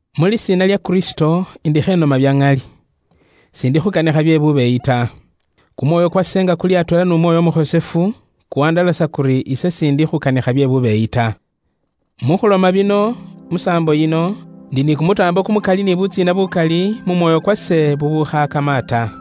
Mu lisiina lya Kristo, indikho inoma bya ŋali. S'indi khuukanikha bye bubeeyi ta. Kumwoyo kwase nga kuli atweela n'Umwoyo Umukhosefu, kuwandalasa kuri ise s'indi khukanikha bye bubeeyi ta. Mu khuloma bino musaambo yino, indi ni kumutaambo kumukali ni butsiina bukali mu mwoyo kwase bubukhaakama ta.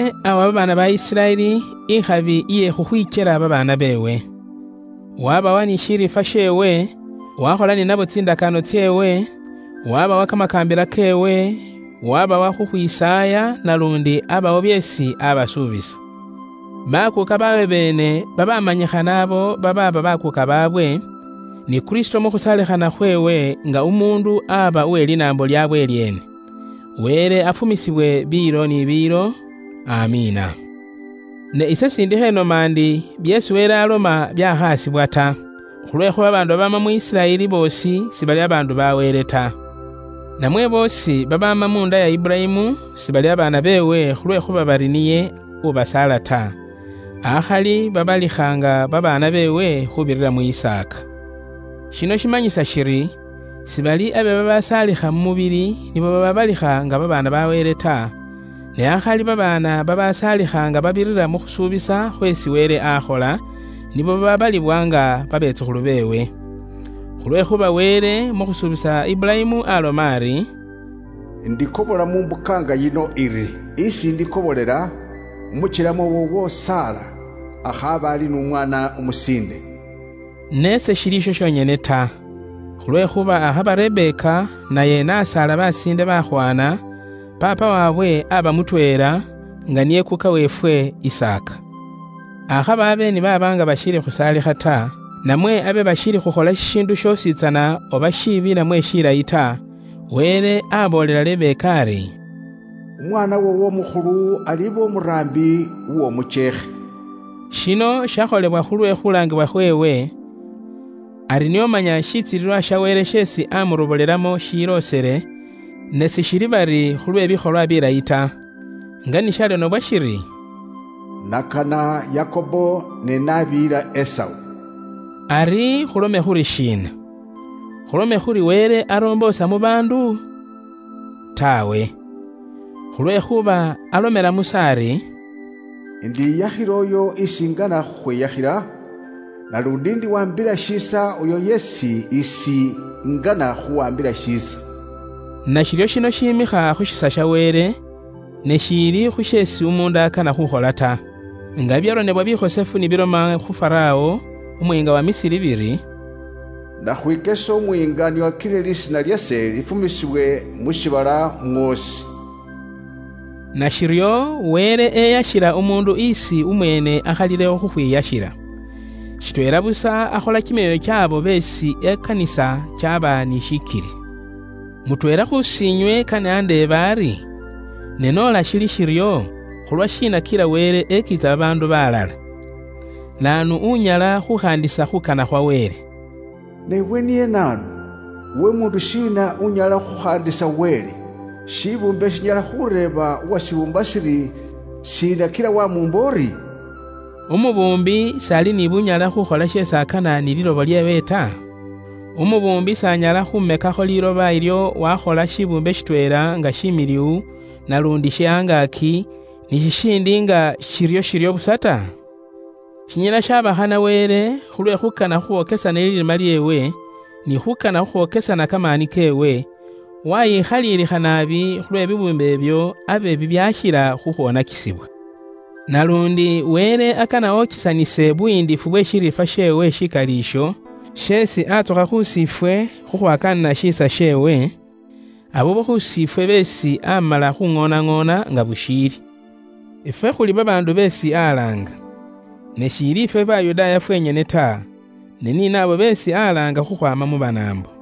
Wele awa babaana ba Isiraeli ikhabi iye khukhwikyela babaana beewe. Wabawa ni shiriifwa sheewe, wakhola ni nabo tsindakaano tseewe, wabawa kamakaambila keewe, wabawa khukhwisaaya, naluundi abawo byeesi abasuubisa. Bakuuka baabwe beene babamanyikhana abo baaba bakuuka baabwe, ni Kristo mu khusaalikhana khweewe nga umuundu aba uwe linaambo lyabwe lyeene. Wele afumisibwe biilo ni biilo. Amiina. Ne ise s'indikho inoma ndi byeesi Wele aaloma byaakhasibwa ta; khulwekhuuba babaandu babaama mu Isiraeli boosi sibali babaandu ba Wele ta. Namwe boosi babaama munda iya Iburayimu sibali babaana beewe khulwekhuuba bari niye ubasaala ta, akhali babalikha nga babaana beewe khuubirira mu Isaaka. Shino shimanyisa shiri sibali abe babaasaalikha mu mubili nibo babaabalikha nga babaana ba Wele ta, ne akhali babaana babaasaalikha nga babirira mu khusuubisa khweesi Wele akhola, nibo babaabalibwa nga babetsukhulu beewe. Khulwekhuuba Wele mu khusuubisa Iburayimu aloma ari, “Indikobola mu mbuka nga yino iri. Isi indi kobolela, umukyelema woowo Sara akhaabe ali n'umwaana umusiinde.” Ne seshili isho shonyene ta. Khulwekhuuba akhaba Rebeka naye n'asaala besiinde bakhwana, paapa waabwe aaba mutweela, nga niye Kuuka weefwe, Isaaka. Akhaba abe ni baaba nga bashiili khusaalikha ta, namwe abe bashiili khukhola shishiindu shoositsana oba shiibi namwe shilayi ta, Wele aboolela Rebeka ari, “Umwaana woowo umukhulu aliba umuraambi w'omukyeekhe.” Shino shakholebwa khulwe khulaangibwa kheewe, ari nio manya shitsilililwa sha Wele sheesi amurobolelamo shiloosele, ne shiili bari khulwe bikholwa bilayi ta. Nga ni sharonebwa shiri, “Nakana Yakobo, ne naabiyila Esau.” Ari khulome khuri shiina? Khulome khuri Wele akhola bye bubwoonaki? Taawe. Khulwekhuuba alomela Musa ari, “Indiyakhila uyo isi ingana khukhwiyakhila; naluundi indiwaambila shiisa uyo yeesi isi ingana khuwaambila shiisa.” Nashiryo shino shimikha khu shiisa sha Wele, ne shiili khu sheesi umuundu akana khukhola ta. Nga bibyaronebwa bikhosefu ni biloma khu Farawo, umuyiinga uwa Misiri biri, “Nakhwikesa umuyiinga nio akile lisiina lyase lifumisibwe mu shiibala mwoosi.” Nashiryo Wele eyashila umuundu isi umweene akhalilewo khukhwiyashila. Shitweela busa akhola kimyoyo kyaabo beesi ekanisa, kyaba ni shikili. Mutweela khusi inywe kane andeebe ari, “Ne noola shili shiryo, khulwashiina kila Wele ekiitsa babaandu baalala? Naanu unyala khuukhaandisa khuukana khwa Wele?” Ne iwe niye naanu? Iwe umuundu shiina unyala khukhaandisa Wele? Shibuumbe shinyala khureeba uwashibuumba shiri, “Shiina kila waamuumba uri?” Umubuumbi s'ali ni bunyala khuukhola sheesi akana ni liiloba lyeewe ta? Umubuumbi s'anyala khuumekakho liiloba ilyo wakhola shibuumbe shitweela nga shimiliwu naluundi she angaaki, ni shishindi nga shiryo busa ta? Shinyala shaba khana Wele, khulwe khuukana khukhwokesana lirima lyeewe, ni khuukana khukhwokesana kamaani keewe, waayikhaliilikha naabi khulwe bibuumbe ibyo abe bibyashila khukhwoonakisibwa. Naluundi Wele akana okesanise buyiindifu bwe shiriifwa sheewe shikali isho, sheesi atsukha khusi ifwe khukhwakaanila shiisa sheewe, abo khusi ifwe beesi amala khuŋoonaŋoona nga bushiili. Ifwe khuli babaandu beesi alaanga. Ne shiili ifwe Bayudaaya fwenyene ta, ne ni naabo beesi alaanga khukhwaama mu Banaambo.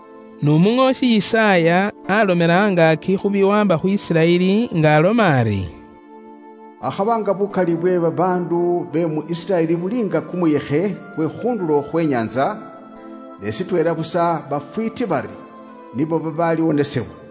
N'umuŋoosi Yisaaya alomela angaaki khu biwaamba khu Isiraeli nga aloma ari, “Akhaba nga bukali bwe babaandu be mu Isiraeli buli nga kumuyekhe kwe khu ndulo khwe inyaantsa, ne shitweela busa bafwiiti bari nibo babaaliwonesebwa.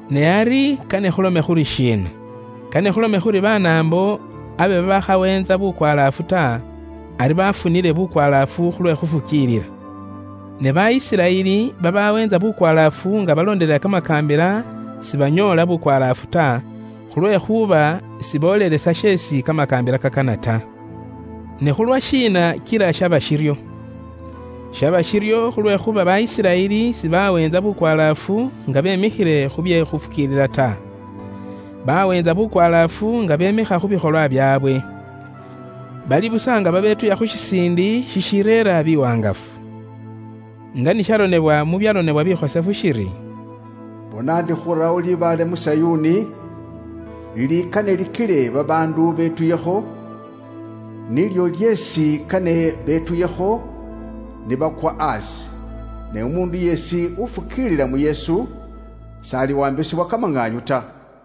Ne ari kane khulome khuri shiina? Kane khulome khuri Banaambo abe babaakhaweentsa bukwalaafu ta, ari bafunile bukwalaafu khulwe khufukiilila. Ne ba Isiraeli babaweentsa bukwalaafu nga baloondelela kamakaambila sibanyoola bukwalaafu ta, khulwekhuuba siboolelesa sheesi kamakaambila kaakana ta. Ne khulwashiina kila shaba shiryo? Shaba shiryo khulwekhuuba ba Isiraeli sibaweentsa bukwalaafu nga bemikhile khu bye khufukiilila ta. Baaweentsa bukwalaafu nga bemikha khu bikholwa byaabwe. Bali busa nga babetuya khu shisiindi shishireera biwaangafu. Nga ni sharonebwa mu byaronebwa bikhosefu shiri, “Bona ndi khurawo libaale mu Sayuuni, lilikane likile babaandu betuyekho. Nilyo lyeesi kane betuyekho ni bakwa aasi. Ne umuundu yeesi ufukiilila mu Yesu, s'aliwaambisibwa kamaŋaanyu ta.”